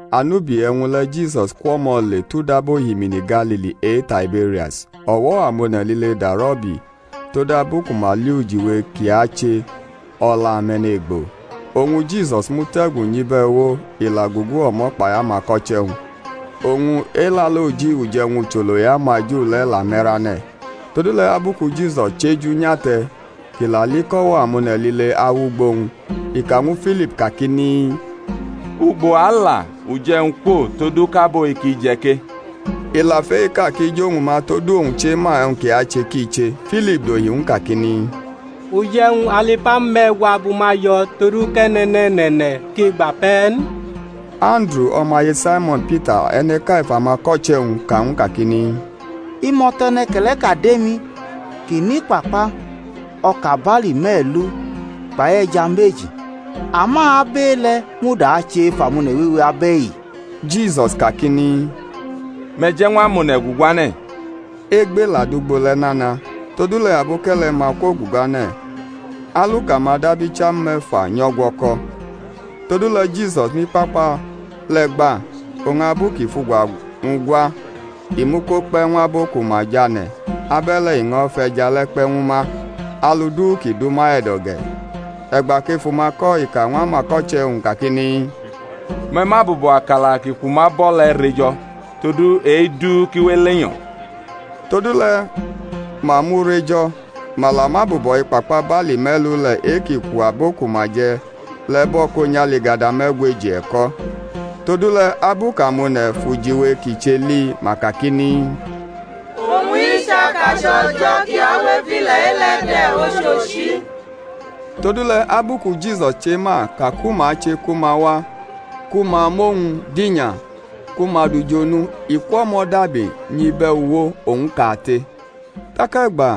Anubi e̩wñ le̩ Jisus kwʼo̩mo̩ le tʼudaba ohimini Galili e-Taiberias. O̩wo̩-amone̩ lile darʼo̩ ubi, todabu ku ma li ujiwe kʼi ache o̩la ame̩ne̩gbo. Oñ Jisus mute̩gu nyʼibe̩uwo, i la gugu o̩mo̩ kpai amako̩che̩-wñ. Oñ Elaloji, uje̩wñ ucholo e-amaju le̩, la me̩rane̩. Todule̩ abu ku Jisus chʼeju nyate̩ kʼi la li kʼo̩wo̩-amone̩ lile awʼugbo-wñ, i ka ñwu Filip kakini, Ugbo a ala uje̩wñ kwo todu kʼabo-i ki je̩ ke? I la fʼe-i ka kʼi jʼowñ ma; todu owñ chema e̩wñ kʼi ache ki che. Filip dohi ñw u kakini, Uje̩wñ alu ipamu me̩gwa bʼuma jo̩ todu kʼe̩ne̩ne̩ne̩ne̩ ki gba pe̩ n. Anduru, o̩maye Saimo̩n Pita, e̩ne̩ʼka ef amako̩che̩-wñ ka ñw u kakini, Imo̩to̩ e̩ne̩ke̩le̩ʼka dʼemi kʼinʼikpakpa o̩ka barli me̩lu kpai e̩ja meji; ama abʼe-le̩ muda ache ef amone̩ wewe abe̩i? Jisus kakini, Me̩ je̩ ñw amone̩ guguane̩. Egbe la dʼugbo le̩ nana. Todule̩ aboke̩le̩-ma kwoguguane̩, aluka-ma dab icham me̩fa nyʼo̩gwo̩ko̩. Todule̩ Jisus mʼikpakpa le̩ gba; oñ abu kʼi fʼugwa-wñ gwa, i mʼu ko kpe̩ ñw abo ku ma jʼane̩; abe̩le̩ i ño̩ fʼe̩ja le̩ kpe̩ ñwu ma, alu du ki dʼuma e̩do̩ ge̩. E̩gba kʼefu-ma ko̩ i ka ñw amako̩che̩-wñ kakini, Me̩ mʼabubo̩ akala ki kwu ma bo̩ le̩ re jo̩, todu kʼe-i du ki we elenyo̩. Todule̩ ma mʼu rejo̩; ma la mʼabubo̩ ikpakpa barli me̩lu le̩ e-ki kwu abo ku ma je̩ le̩ bo̩ ko nyʼaligada me̩gweji e̩ko̩. Todule̩ abu kʼamone̩ fʼujiwe kʼi che li, ma kakini, Owñ-i chʼakache̩ O̩jo̩ ki awʼef ile̩-i le̩ de̩, ochochi. Todule̩ abu ku Jisus chema ka ku ma che ku ma wa ku ma mʼowñ dinya ku ma dʼu jʼonu, i kwʼo̩mo̩ dabi nyʼibe̩uwo, owñ kate. Tak e̩gba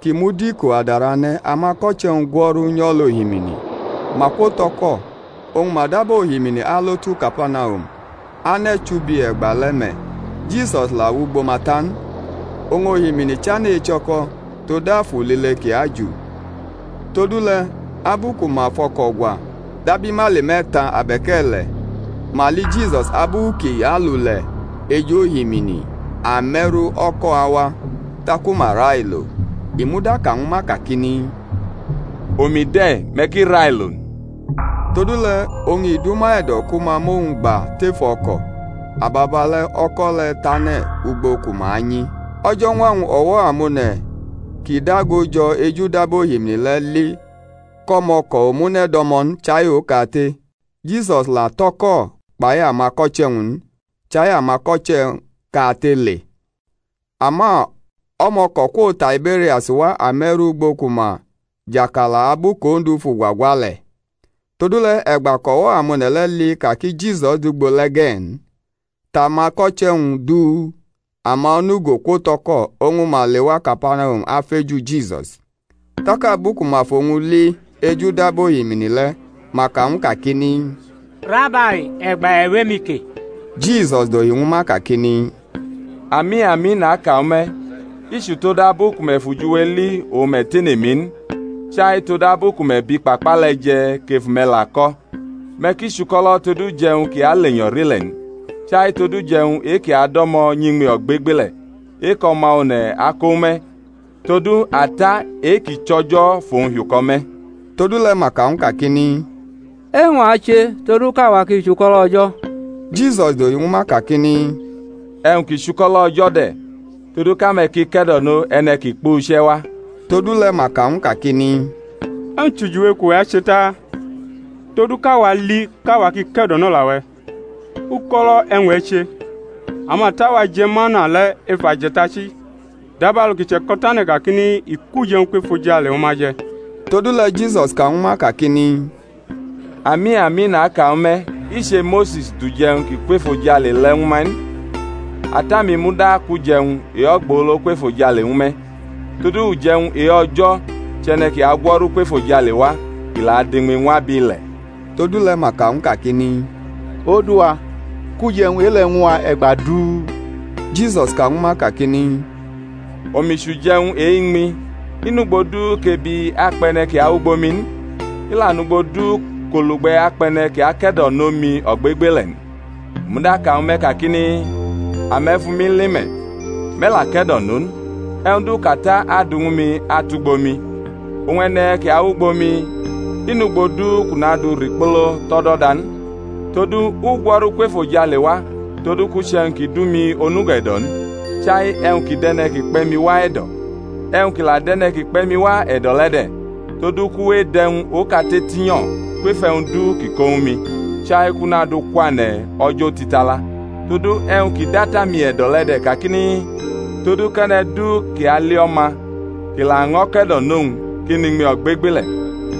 ki mud iko adarane̩, amako̩che̩-wñ gwo̩ru nyʼo̩lʼohimini. Ma kwo tʼo̩ko̩, oñ ma daba ohimini alo tu Kapanahum; ane̩ chubi e̩gbale̩ me̩, Jisus la wʼugbo ma ta n. Oñ ohimini chane̩ echo̩ko̩ tod afu lile ki aju. Todule̩ abu ku ma fʼo̩ko̩ gwa dab imaili me̩ta abe̩k e̩le̩, ma li Jisus abu kʼi alule̩ ej ohimini ame̩ru o̩ko̩ awa; taku ma railo. I muda ka ñwu ma kakini, Omi de̩, me̩ ki railo n. Todule̩ oñ i dʼuma e̩do̩ ku ma mʼowñ gba tef o̩ko̩; ababa le̩ o̩ko̩ le̩ tʼane̩ ugbo ku ma anyi. O̩jo̩ñwa-wñ o̩wo̩-amone̩ ki dago jo̩ ejudaba ohimini le̩ li kʼo̩mo̩ko̩ omune̩ do̩mo̩ n chai okate; Jisus la tʼo̩ko̩ kpai amako̩che̩-wñ n, chai amako̩che̩ kate le̩ (ama o̩mo̩ko̩ kwo Taibe̩rias wa ame̩ru ugbo ku ma jʼakala abu kʼOndu fʼugwa gwa le̩); todule̩ e̩gba kʼo̩wo̩-amone̩ le̩ li ka ki Jisus dʼugbo le̩ ge̩ n, tʼamako̩che̩-wñ duu, ama onugo kwo̩tʼo̩ko̩, oñ ma lewa Kapanahum afeju Jisus. Tak abu ku ma fʼowñ li ejudaba ohimini le̩ ma ka ñw u kakini, Rabai, e̩gba e̩ wʼemi ke? Jisus dohi ñwu ma kakini, Ami, ami, naka ñwu me̩, i chʼutodabu ku me̩ fʼujiwe li oñ me̩ tene mi n, chai todabu ku me̩ bʼikpakpa le̩ je̩ kʼefu-me̩ la ko̩. Me̩ ki chuko̩lo̩ tod uje̩wñ ki alenyo̩ rʼile̩ n, chai tod uje̩wñ e-ki ado̩mo̩ nyʼiñmi ogbegbele̩, e-kʼO̩ma One̩ ako ñwu me̩; todu Ata, e-ki chʼO̩jo̩, fʼowñ hiuko̩ me̩. Todule̩ ma ka ñw u kakini, E̩wñ a che todu kʼawa ki chʼuko̩lo̩ O̩jo̩? Jisus dohi ñwu ma kakini, E̩wñ ki chʼuko̩lo̩ O̩jo̩ de̩, todu kʼame̩ ki ke̩do̩no e̩ne̩ kʼi kpuche̩ wa. Todule̩ ma ka ñw u kakini, E̩wñ chʼujiwe kʼuwe̩ ache ta, todu kʼawa li kʼawa ki ke̩do̩nola-we̩? Uko̩lo̩ e̩wñ e̩ che? Amata-wa je̩ mana le̩ ef aje̩tachi; dabalu ki che̩ko̩tane̩ kakini, I kʼuje̩wñ kwʼefojale ñwu ma je̩. Todule̩ Jisus ka ñwu ma kakini, Ami, ami, naka ñwu me̩, i che Mose̩s dʼuje̩-wñ ki kwʼefojale le̩ ñwu me̩ n; Ata-mi muda akʼuje̩wñ e-ogbolo kwʼefojale ñwu me̩. Todu uje̩wñ e-O̩jo̩ chʼe̩ne̩ ki agwo̩ru kwʼefojale wa, kʼi la adʼiñmi ñw abile̩. Todule̩ ma ka ñw u kakini, Odu-wa, kʼuje̩wñ e-le̩ ñw u wa e̩gba du. Jisus ka ñwu ma kakini, Omi chʼuje̩wñ e-iñmi; i nugbo du kʼebi akpʼe̩ne̩ ki awʼugbo mi n; i la nugbo du kʼolugbe̩ akpʼe̩ne̩ ki ake̩do̩nʼomi ogbegbele̩ n. U muda ka ñwu me̩ kakini, Ame̩ fʼumi li me̩, me̩ la ke̩do̩no n. E̩wñ du kʼAta adu ñwu mi atʼugbo mi, oñ e̩ne̩ ki awʼugbo mi, i nugbo du kʼu nadu rikpolo tʼo̩do̩da n. Todu u gwo̩ru kwʼefojale wa todu kʼu chʼe̩wñ ki dʼumi onugo e̩do̩ n, chai e̩wñ ki dʼe̩ne̩ ki kpe̩ mi wa e̩do̩. E̩wñ ki la dʼe̩ne̩ ki kpe̩ mi wa e̩do̩ le̩ de̩, todu kʼu we edʼe̩wñ okate tinyo̩ kwef e̩wñ du kʼi ko ñwu mi, chai kʼu nadʼu kwane̩ o̩jo̩ otitala. Todu e̩wñ ki dʼAta-mi e̩do̩ le̩ de̩ kakini, todu kʼe̩ne̩ du ki ali O̩ma, kʼi laño̩ ke̩do̩nʼowñ, ki nʼinmi ogbegbele̩,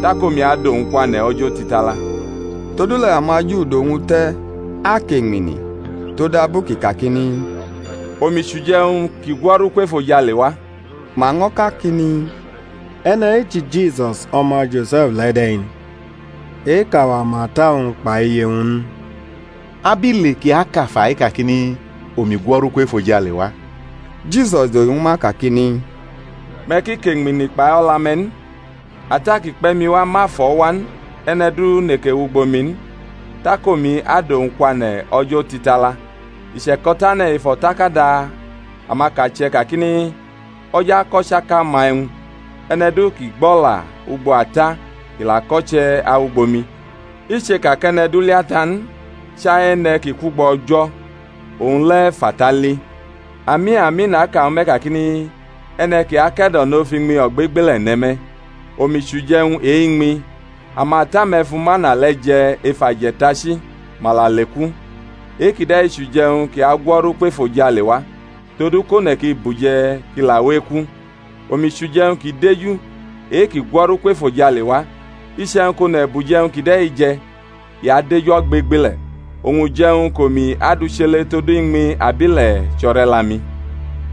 tak omi adʼowñ kwane̩ o̩jo̩ otitala. Todule̩ amaJu dʼowñ te̩ akeñmini, todabu kʼi kakini, Omi chʼuje̩-wñ ki gwo̩ru kwʼefojale wa. Ma ño̩ kakini, E̩ne̩-i chʼiJisus o̩ma Jose̩f le̩ de̩ n? e-kʼawa ma ata-wñ kpai iye-wñ n? Abile kʼi aka fa-i kakini, Omi gwo̩ru kwʼefojale wa? Jisus dohi ñwu ma kakini, Me̩ ki keñmini kpai o̩la-me̩ n. Ata ki kpe̩ mi wa ma fʼo̩ wa n; e̩ne̩ du neke wʼugbo mi n, tak omi adʼuwñ kwane̩ o̩jo̩ otitala. I che̩ko̩tane̩ ef o̩takada amakache̩ kakini, O̩jo̩ akʼo̩chaka-ma e̩wñ. E̩ne̩ du ki gbʼo̩la ugbo Ata, ki la ko̩che̩, awugbo mi. I cheka kʼe̩ne̩ du li Ata n, chai e̩ne̩ ki kwʼugbo O̩jo̩; owñ le̩ fʼAta li. Ami, ami, naka ñwu me̩ kakini, E̩ne̩ ki ake̩do̩no fʼiñmi ogbegbele̩ ne̩ me̩. Omi chʼuje̩wñ e-iñmi. Amata-me̩ fu mana le̩ je̩ ef aje̩tachi, ma la leku. E-kide̩ chʼuje̩wñ ki agwo̩ru kwʼefojale wa, todu kʼone̩ ki buje̩, kʼi la we eku. Omi chʼuje̩wñ ki deju e-ki gwo̩ru kwʼefojale wa; iche̩wñ kʼone̩ bʼuje̩wñ kide̩ je̩ i adeju ogbegbele̩, oñ uje̩wñ kʼomi adu chele todu iñmi abʼile̩ chʼo̩re̩la-mi.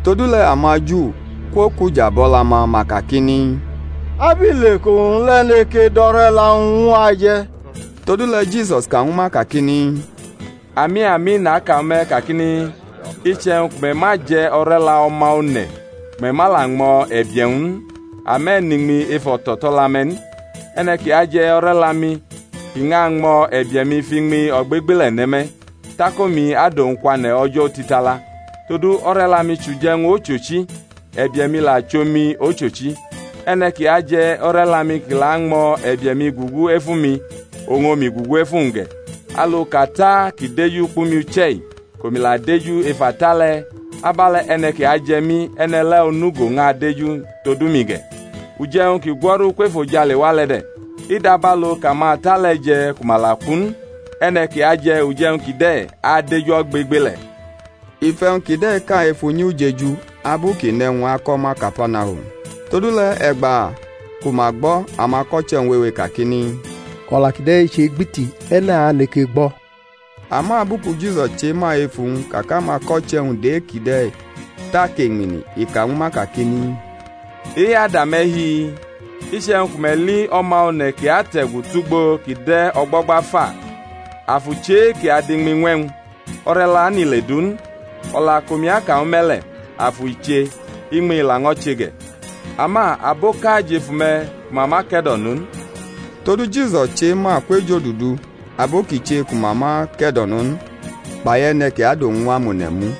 Todule̩ amaJu kwokʼuja bʼo̩la-ma, ma kakini, Abile kʼowñ le̩ neke dʼo̩re̩la-wñ ñw a je̩? Todule̩ Jisus ka ñwu ma kakini, Ami, ami, naka ñwu me̩ kakini, Iche̩wñ ku me̩ ma je̩ o̩re̩la O̩ma One̩ ku me̩ ma la ñmo̩ e̩bie̩-wñ n, ame̩ nʼiñmi ef o̩to̩to̩la-me̩ n. E̩ne̩ ki aje̩ o̩re̩la-mi kʼi ñʼañmo̩ e̩bie̩-mi, fʼiñmi ogbegbele̩ ne̩ me̩; tak omi adʼowñ kwane̩ o̩jo̩ otitala. Todu o̩re̩la-mi chʼuje̩wñ ochochi, e̩bie̩-mi la chʼomi ochochi. E̩ne̩ ki aje̩ o̩re̩la-mi kʼi la añmo̩ e̩bie̩-mi gugu ef umi oñ omi gugu ef uwñ ge̩. Alu kʼAta ki deju kpʼumi uche̩-i kʼomi la deju lef Ata le̩, abe̩le̩ e̩ne̩ ki aje̩ mi, e̩ne̩ le̩ onugo ñʼadeju todu mi ge̩. Uje̩wñ ki gwo̩ru kwʼefojale wa le̩ de̩; i dabalu kʼamata le̩ je̩ ku ma la ku n; e̩ne̩ ki aje̩ uje̩wñ kide̩ adeju ogbegbele̩. I fʼe̩wñ kide̩ ka ef unyi ujeju, abu kʼi nʼe̩wñ ako̩ ma Kapanahum. Todule̩ e̩gba ku ma gbo̩ amako̩che̩-wñ wewe kakini, O̩la kide̩ che-gbiti; e̩ne̩ aneke gbo̩? Ama abu ku Jisus chema ef uwñ ka kʼamako̩che̩-wñ dʼe-kide̩ tʼakeñmini, i ka ñwu ma kakini, E-i ada me̩ hi-i? Iche̩wñ ku me̩ li O̩ma One̩ kʼi ate̩gu tʼugbo kʼi de̩ o̩gbo̩gba fa? Afu chʼe-ki adʼiñmi ñw e̩wñ, o̩re̩la nʼile du n; o̩la kʼomi ka ñwu me̩ le̩, afu i che, iñmi i laño̩ che ge̩. Ama aboʼka jʼef ume̩ ku ma ma ke̩do̩no n. Todu Jisus chema kwʼejodudu abo ki che ku ma ma ke̩do̩no n, kpai e̩ne̩ ki adʼowñ ñw amone̩ mu.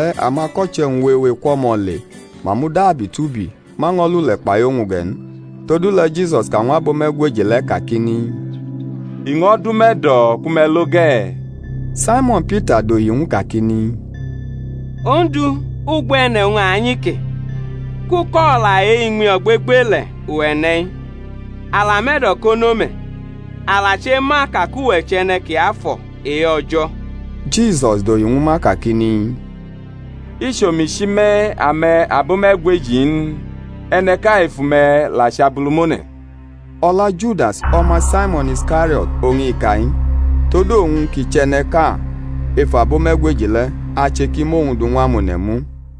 Akwe̩gbale̩ amako̩che̩-wñ wewe kwʼo̩mo̩ le, ma mudabi tubi, ma ño̩ lule̩ kpai owñ ge̩ n. Todule̩ Jisus ka ñw abo me̩gweji le̩ kakini, I ño̩ dʼume̩ e̩do̩ ku me̩ lo ge̩? Saimo̩n Pita dohi ñw u kakini, Ondu, ugbo e̩ne̩ owñ a anyi ke? kʼuko̩la e-iñmi ogbegbele̩ uwe̩ ne̩-i. A la mʼe̩do̩ kono me̩, a la chema ka kʼuwe̩ chʼE̩ne̩ Kiafo̩ e-O̩jo̩. Jisus dohi ñwu ma kakini, I chʼomi chi me̩, ame̩ abome̩gweji-i n? E̩ne̩ʼka efu me̩ la chʼabulumone̩. O̩la Judas, o̩ma Saimo̩n Iskario̩t oñ i ka-i, todu owñ, kʼi chʼe̩ne̩ʼka ef abo-me̩gweji le̩, ache ki mʼowñ du ñw amone̩ mu.